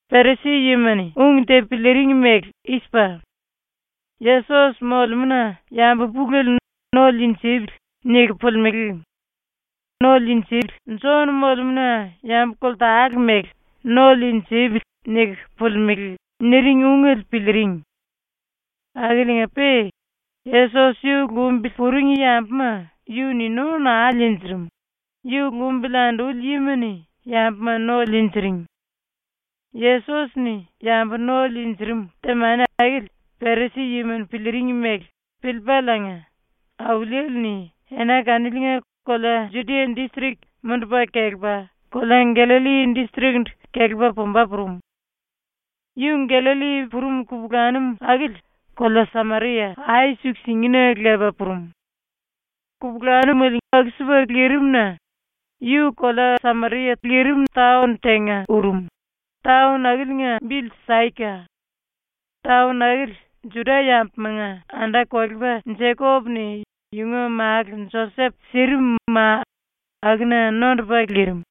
Perisi-yima-ni ung te piliiring mele i-sipa: “Yesos molemúna yambu pulele ‘No liinjipili.’ niku pulimelé, Jon molemúna yambu koltale mele ‘No liinjipili.’ niku pulimelé.” niring ungele piliiring. (Akiliinga-pe Yesos yu lumbili puring yambuma yu-ni no naa liinjirim, yu lumbili anduli yima-ni yambuma no liinjiring.) ⸤Yesos-ni yambu no liinjirim⸥ temani akili Perisi-yima-ni piliiring mele piliipaliinga Auliele-ni ena kaniliinga kolea Judia distrik mundupa kelepa kolea Gallalli distrik-ndu kelepa pumba purum. Yu Gallalli purum kupulanum akili kolea Sameria ai-suku-singina lepa purum. Kupulanumele aku-sipa lirim-na yu kolea Sameria taon tenga urum, taon akiliinga bili Saika. Taon akili Juda-yambumanga anda-kolepa Jekop-ni yunga málu Josep sirim ma akuna nondupa lirim.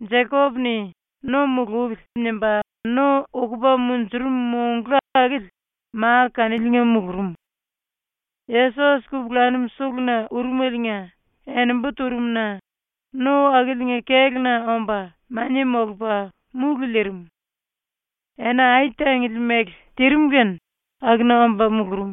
Jekop-ni ‘No mulupili.’ nimba no ukupa munjurum monglu akili ma kaniliinga mulurum. Yesos kupulanum suluna urumeliinga enembu turum-na no akiliinga kéluna omba mania molupa múlu liirim. Ena ai-tangili mele tirim kene akuna omba mulurum.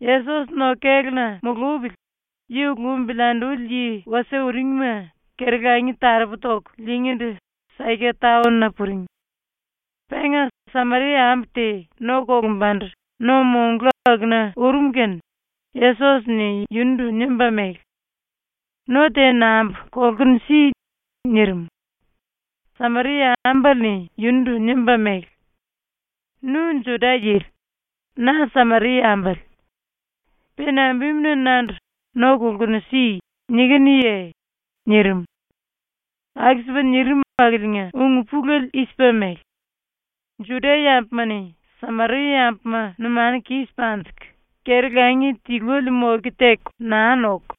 (Yesos no-kéluna mulupili yu lumbili anduli yi wasie uringma keri-langi taropu toku liingíndu Saika taon-na puring.) Penga Sameria-ambu te no kolumbandu no-monglu akuna urum kene Yesos-ni yundu nimba mele: “No te nambu kolkunu si.” nirim. Sameria-ambale-ni yundu nimba mele: “Nu Juda-yili. Na Sameria-ambale. Pe nambimuna nandu “No kolkunu si.” nikinuye?” nirim. (Aku-sipa nirim akiliinga ung-pulele i-sipa mele: Juda-yambuma-ni Sameria-yambuma numanu kis panjiku keri-langi tiluele moke teku naa noku,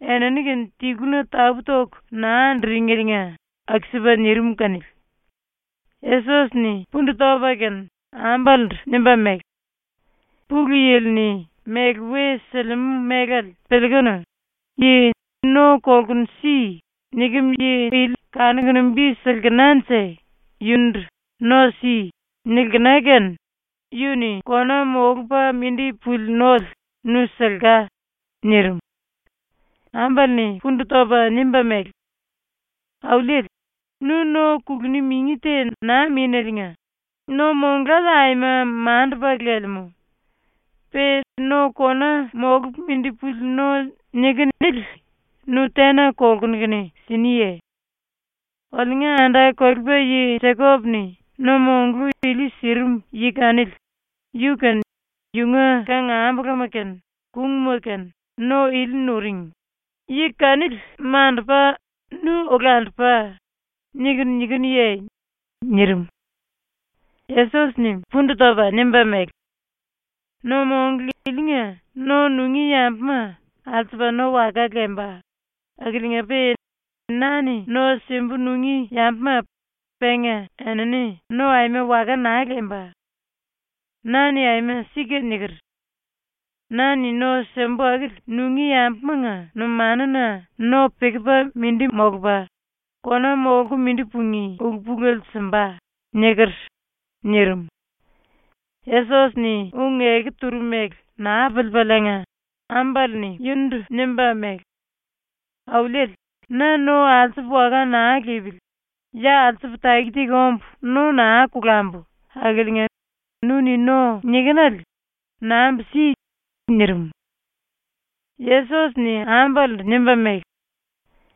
enini-kene tiluna tapú-toku naa anduringeliinga aku-sipa nirim kanili.) Yesos-ni pundu topa kene ambalendu nimba mele: “Pulu Yili-ni méle we silimú mélale piliikunu, yi “No kolkunu si.” nikem yi ili kanukunu bi silkenanje yundu “No si.” nilkena kene yu-ni kona molupa mindi puli nole nu silka.” nirim. Ambale-ni pundu topa nimba mele: “Auliele, nu no kuluni mingi te naa míneliinga, no-monglale aima mandupa lelemú. Pe no kona molupa mindi puli no nikinu ili nu tena kolkunu kene siniye? Oliunga anda-kolepa yi Jekop-ni no-monglu ili sirim yi kanili, yu kene yunga kangambulama kene kungma kene no ili nuring, ‘yi kanili mandupa nu olandupa.’ niku nikinuye?” nirim. Yesos-ni pundu topa nimba mele: “No-monglu ilinga no nungí yambuma alsupa no waka lemba, akiliinga-pe na-ni no simbu nungí yambuma penga enini no aima waka naa lemba. Na-ni aima sika niker: “Na-ni no simbu akili nungí yambumanga numanuna no pikipa mindi molupa, kona molku mindi pungí ulu-pulele simba.” niker.” nirim. ⸤Yesos-ni ung-eku turum mele naa piliipaliinga,⸥ ambale-ni yundu nimba mele: “Auliele, na no alsupa waka naa lipili, ya alsupu taki-taki ombu no naa kolambu akiliinga nu-ni no nikinele nambu si.” nirim. Yesos-ni ambalendu nimba mele: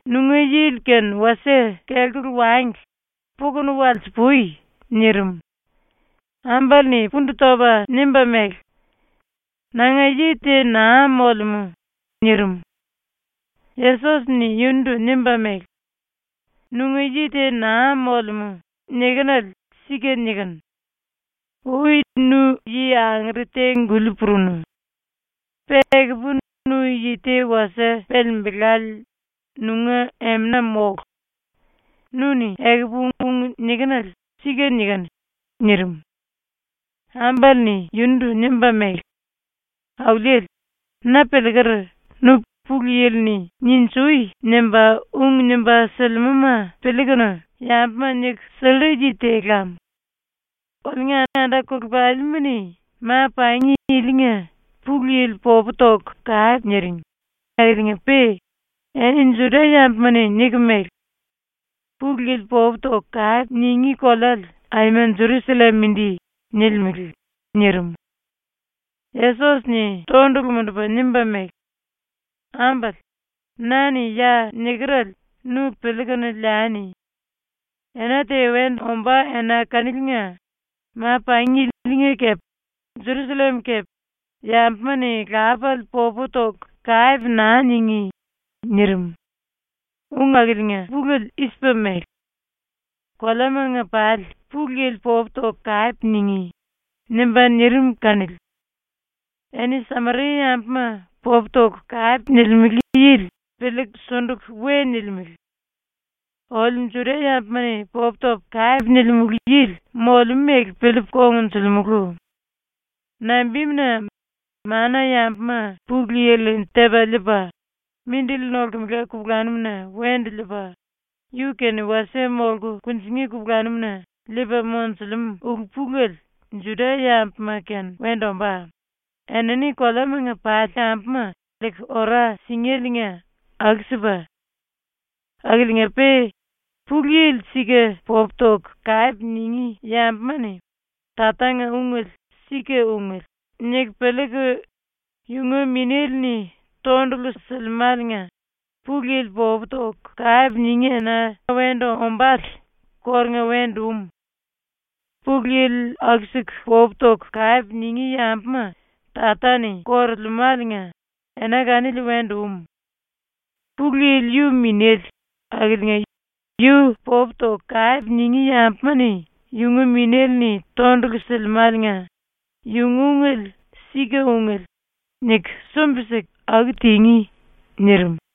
“Nunga yili kene wasie kelkulu wangli, pukunu walsi-pui.” nirim. Ambale-ni pundu topa nimba mele: “Nanga yi te naa molemú.” nirim. Yesos-ni yundu nimba mele: “ “Nunga yi te naa molemú.” nikinele sika nikinu. Ui nu yi angere te-guli purunu. Pe ekupu nu yi te wasie pelembelale nunga emena mólu. Nu-ni ekupu ung nikinele sika nikinu.” nirim. Ambale-ni yundu nimba mele: “Auliele, na piliiker nu Pulu Yili-ni “Ninjui!” nimba ung nimba silimúma piliikunu yambuma niku sillu yi te lam. Oliunga anda-kolepalima-ni ma-pangi ilinga Pulu Yili popu toku kape niring akiliinga-pe eni Juda-yambuma-ni niku mele: “Pulu Yili popu toku kape ningí koleale aima Jerusallem mindi.” nilimele.” nirim. Yesos-ni tondulu mundupa nimba mele: “Ambale, na-ni ya nikerele nu piliikunu liani. Ena te wendu ombá ena kaniliinga ma-pangi ilinga kepe Jerusallem kepe yambuma-ni Lapale popu toku kape naa ningí.” ⸤nirim. Ung akiliinga pulele i-sipa mele: “Koleamanga pali Pulu Yili popu toku kape ningí.” nimba nirim kanili.⸥ “Eni Sameria-yambuma popu toku kape nilimele yili piliiku sunduku we nilimele. Oliu Juda-yambuma-ni popu topu kape nilimulu yili molemú mele piliipu kongnjulimulu. Nambimuna, mana-yambuma Pulu Yili-ni tepa liipa, mindili nolkemela kupulanum-na wendu liipa, yu-kene wasie molku kunjingí kupulanum-na liipa monjulemú ulu-pulele Juda-yambuma-kene wendu ombá, enini koleamanga pali yambuma liiku ora singéliinga aku-sipa. Akiliinga-pe Pulu Yili sika popu toku kape ningí yambuma-ni Tatanga ungele ‘Sika ungele.’ niku piliiku yunga Minéle-ni tondulu silimáliinga Pulu Yili popu toku kape ningí ena wendu ombále kórunga wendu um. Pulu Yili aku-siku popu toku kape ningí yambuma Tata-ni korolemáliinga, ena kanili wendu um. Pulu Yili yu minéle, akiliinga yu popu toku kape ningí yambuma-ni yunga Minéle-ni tondulu silimáliinga ‘Yunga ungele sika ungele.’ niku sumbi-siku aku tingí.” nirim.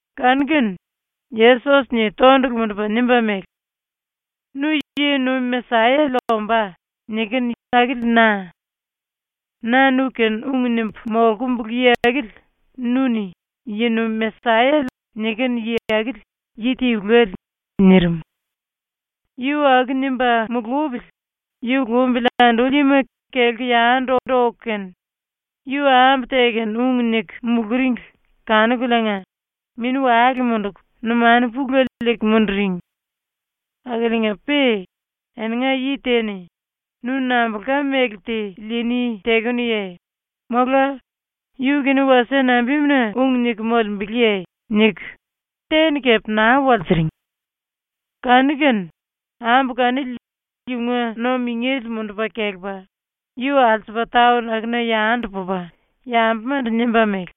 Kanu-kene Yesos-ni tondulu mundupa nimba mele: “Nu “Yi-nuim Mesayale ombá.” nikinu akili na. Na nu-kene ung nimbu molkumbulu yi akili nu-ni “Yi-nuim Mesayale” nikinu yi akili yi tiluele.” nirim. Yu aku nimba mulupili yu lumbili anduli yima kelku yandu oku kene, yu ambu te kene ung niku muluringli kanukuliinga mini-wale munduku numanu pulele liiku munduring. Akiliinga-pe eninga yi te-ni “Nu nambulka méle te liini tekenuye?”, mola “Yu-kene wasie nambimuna ung niku molembeleye?” niku te-ni kepe naa walsiring. Kanu-kene ambu kanili yunga no-mingele mundupa kelepa yu alsupa taon akuna yandu pupa yambumandu nimba mele: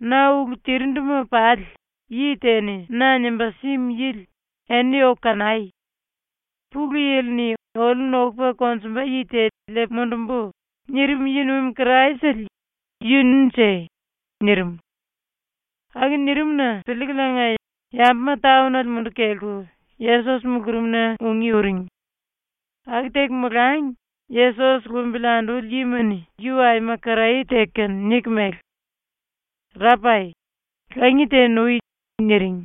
“Na ulu tirinduma pali yi te-ni na nimba símu yili eni oku kanai! Pulu Yili-ni ‘Oliu nokupa konjumba yi te liipu mundumbu.’ nirim yi-nuim Kraisele yununje.” nirim. Aku nirim-na piliikuliinga yambuma taonale munduku kelku Yesos mulurumna ungí uring. Aku teku molangi Yesos lumbili anduli yima-ni yu aima karaye teku kene niku mele: “Rapai, langi te nui.” niring.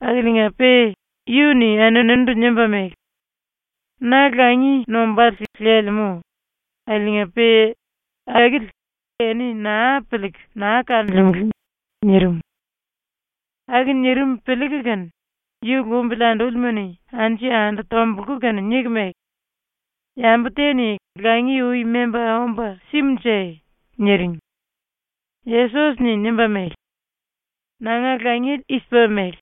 Akiliinga-pe yu-ni eninindu nimba mele: “Na langi nombále lelemú, akiliinga-pe akili eni naa piliiku naa kanolemele.” nirim. Aku nirim piliiku kene yu lumbili andúlima-ni anju-yandu tombulku kene niku mele: “Yambu te-ni langi ui memba omba simunje?” niring. Yesos-ni nimba mele: “Nanga langiele i-sipa mele: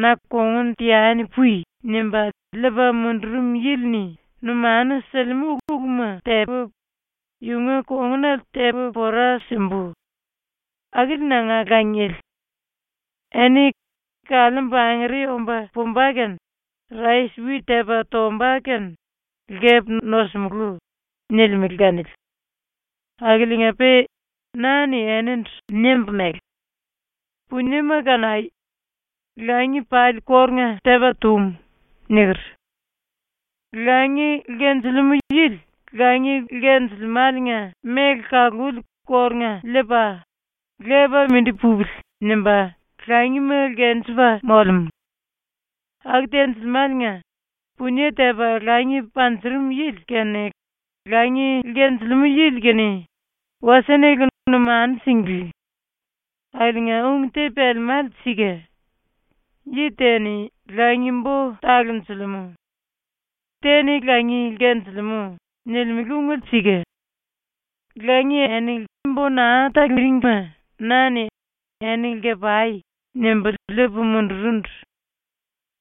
Na ‘kongun teani pui.’ nimba liipa mundurum yili-ni numanu silimú uluma tepu, yunga kongunale tepu pora simbu. Akili nanga langiele. Eni “Kaliimbu angere omba pumba kene rais-wit tepa tomba kene lkepu nosimulú.” nilimele kanili. Akiliinga-pe na-ni enindu nimbu mele: “Puniema kanai! Langi pali kórunga tepa tum.” niker. Langi lkenjilimú yili langi lkenjilimáliinga méle kaluli kórunga liipa, ‘Lepa mindi pupili.’ nimba langima lkenjepa molemú. Aku tenjilimáliinga punie tepa langi panjurum yili kene langi lkenjilimú yili kene wasie-nele numanu singlí. Akiliinga ung te pelemále sika. ‘Yi te-ni langi-bo talonjilimú. Te-ni langi lkenjilimú.’ nilimele ungele sika. Langi eni bo naa taluringima na-ni “Eni lke-pai.” nimbu liipu mundurundu.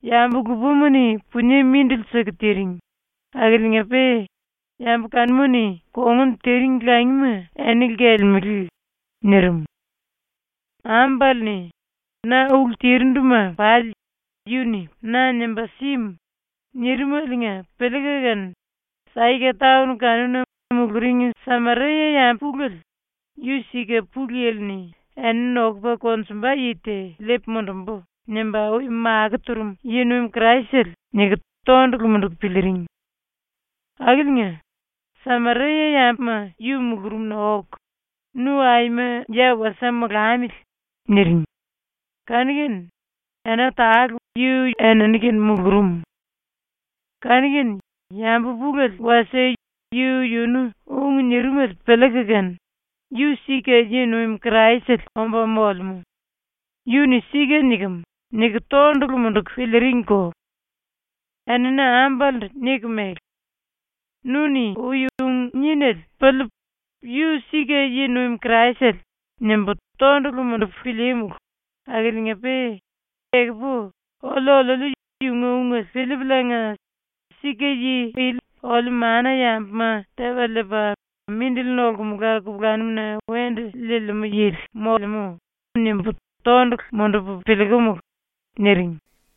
Yambu lupama-ni punie mindili siku tiring, akiliinga-pe yambu kanuma-ni kongun tiring langima eni lkelemele.” nirim. Ambale-ni “Na ulu tirinduma pali yu-ni na nimba símu.” nirimeliinga piliiku kene ⸤Saika⸥ taon kanuna muluring Sameria-yambu pulele ‘Yu sika ⸤Pulu Yili-ni ‘Eni nokupa konjumba yi te liipu mundumbu.’ nimba ui makó turum⸥ yi-nuim Kraisele.’ niku tondulu munduku piliiring. Akiliinga, Sameria-yambuma yu mulurumna oku, “Nu aima ya wasie molamili.” niring, kanu-kene ena tale yu enini-kene mulurum. Kanu-kene yambu pulele wasie yu-yunu ung nirimele piliiku kene ‘Yu sika ⸤yi-nuim Kraisele omba molemú. Yu-ni sika nikem.⸥’ niku tondulu munduku piliiringko. Enini ambalendu niku mele: “Nu-ni ui ung nínele piliipu ‘Yu sika yi-nuim Kraisele.’ nimbu tondulu mundupu pilíímulu akiliinga-pe ekupu oliu-oliuliu yunga ungele piliipuliinga ‘Sika yi ili oliu mana-yambuma Tepa Liipa, Mindili Nolkumula Kupulanum-na Wendu Liilimú Yili molemú.’ nimbu tondulu mundupu piliikumulu.” niring.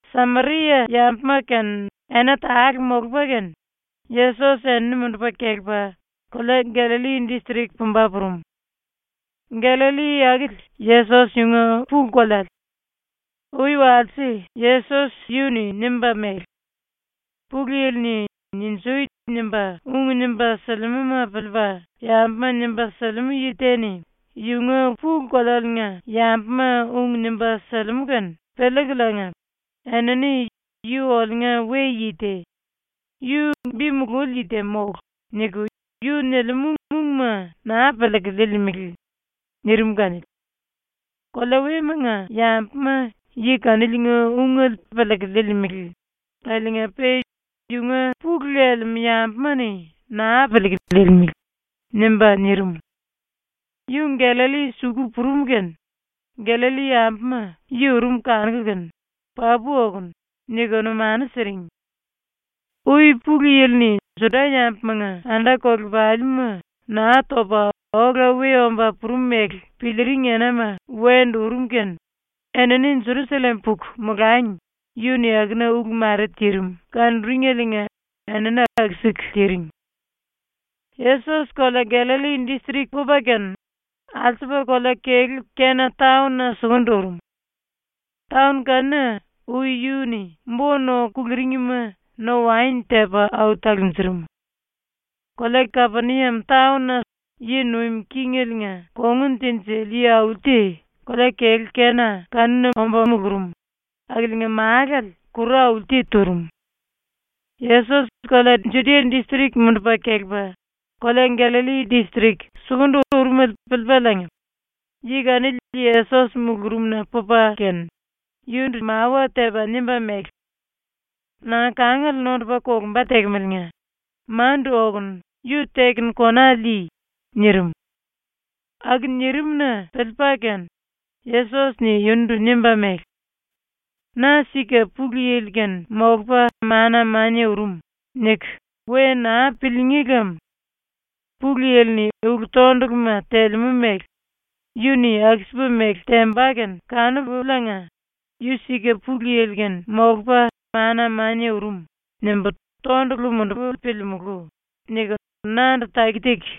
Sameria-yambuma kene ena tale molupa kene Yesos enini mundupa kelepa kolea Gallalli distrik pumba purum. (Gallalli akili Yesos yunga pulu-koleale. Ui walse Yesos yu-ni nimba mele: “Pulu Yili-ni “Ninjui!” nimba ung nimba silimúma piliipa yambuma nimba silimú yi te-ni yunga pulu-kolealiinga yambuma ung nimba silimú kene piliikuliinga, enini ‘Yu oliunga we-yi te. Yu bi mululi yi te mólu.’ niku yu nilimú ungma naa piliiku liilimele.” nirim kanili.) ⸤‘Kolea wemanga yambuma yi kaniliinga ungele piliiku liilimele akiliinga-pe yunga pulu lelemú yambuma-ni naa piliiku liilimele.’ nimba nirim.⸥ Yu Gallalli suku purum kene Gallalli-yambuma yu urum kanuku kene “Papu okonu.” niku numanu siring. Ui Pulu Yili-ni Juda-yambumanga anda-kolepalima Naa Topa Ola We Omba Purum mele piliiring enama wendu urum kene enini Jerusallem puku molangi yu-ni akuna ulu mare tirim kanuringeliinga enini aku-siku tiring. Yesos kolea Gallalli distrik pupa kene alsupa kolea-kelú Kena taon-na sukundu urum. Taon kanuna ui yu-ni bo-no kuluringima no-waen tepa au talunjurum. Kolea-kelú Kapeniam taon yi nuim kingeliinga kongun tinjili yi-auli te kolea-kelú Kena kanuna mulurum, akiliinga málale kuru auli te turum. Yesos kolea Judia distrik mundupa kelepa kolea Gallalli distrik sukundu urumele piliipaliinga, yi kanili Yesos mulurumna pupa kene, yundu mawa tepa nimba mele: “Nanga kangale nondupa kolumba tekemeliinga mandu okunu yu tekunu kona lii.” nirim. Aku nirim-na piliipa kene Yesos-ni yundu nimba mele: “‘Na sika ⸤Pulu Yili-kene molupa mana-mania urum⸥.’ niku we naa piliingí lem. Pulu Yili-ni ulu-tonduluma telemú mele ‘Yu-ni aku-sipa mele temba kene kanupuliinga ‘Yu sika ⸤Pulu Yili-kene molupa mana-mania urum⸥.’ nimbu tondulu mundupu piliimulú.’ niku nandu taki-taki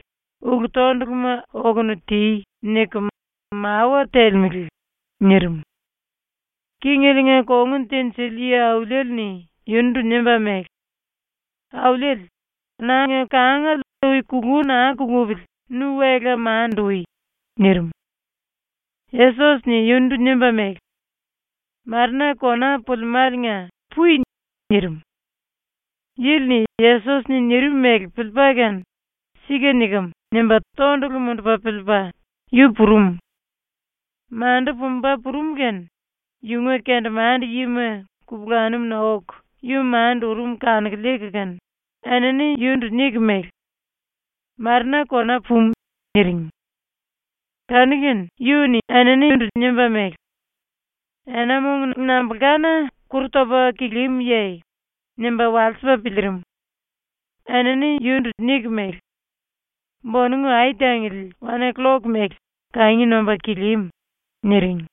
“Ulu-tonduluma okunu ti.” niku mawa telemele.” nirim. Kingeliinga kongun tinjili yi-auliele-ni yundu nimba mele: “Auliele, nanga kangale ui kulu naa kulupili nu wela mandu ui.” nirim. Yesos-ni yundu nimba mele: “Marena kona pulimáliinga pui.” nirim. Yili-ni Yesos-ni nirim mele piliipa kene ‘Sika nikem.’ nimba tondulu mundupa piliipa yu purum. Mandu pumba purum kene yunga kendemande-yima kupulanum-na oku yu mandu urum kanuku liiku kene enini yundu niku mele: “Marena kona pumu.” niring. Kanu-kene yu-ni eninindu nimba mele: “Ena-mong nambulkana kuru topa kilímuye?” nimba walsipa piliirim. Enini yundu niku mele: “Bonongu ai-tangili wan-killok mele kangi nomba kilímu.” niring.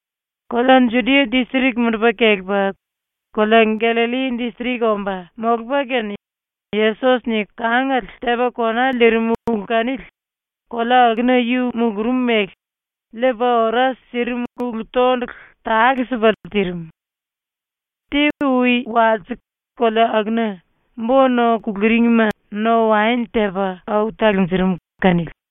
Kolea Judia distrik mundupa kelepa kolea Gallalli distrik omba molupa kene Yesos-ni kangale tepa kona liirim ulu kanili kolea akuna yu mulurum mele liipa ora sirim ulu-tondulu tale-sipale tirim. Te ui walse kolea akuna bo-no kuluringima no-waen tepa au talunjurum kanili.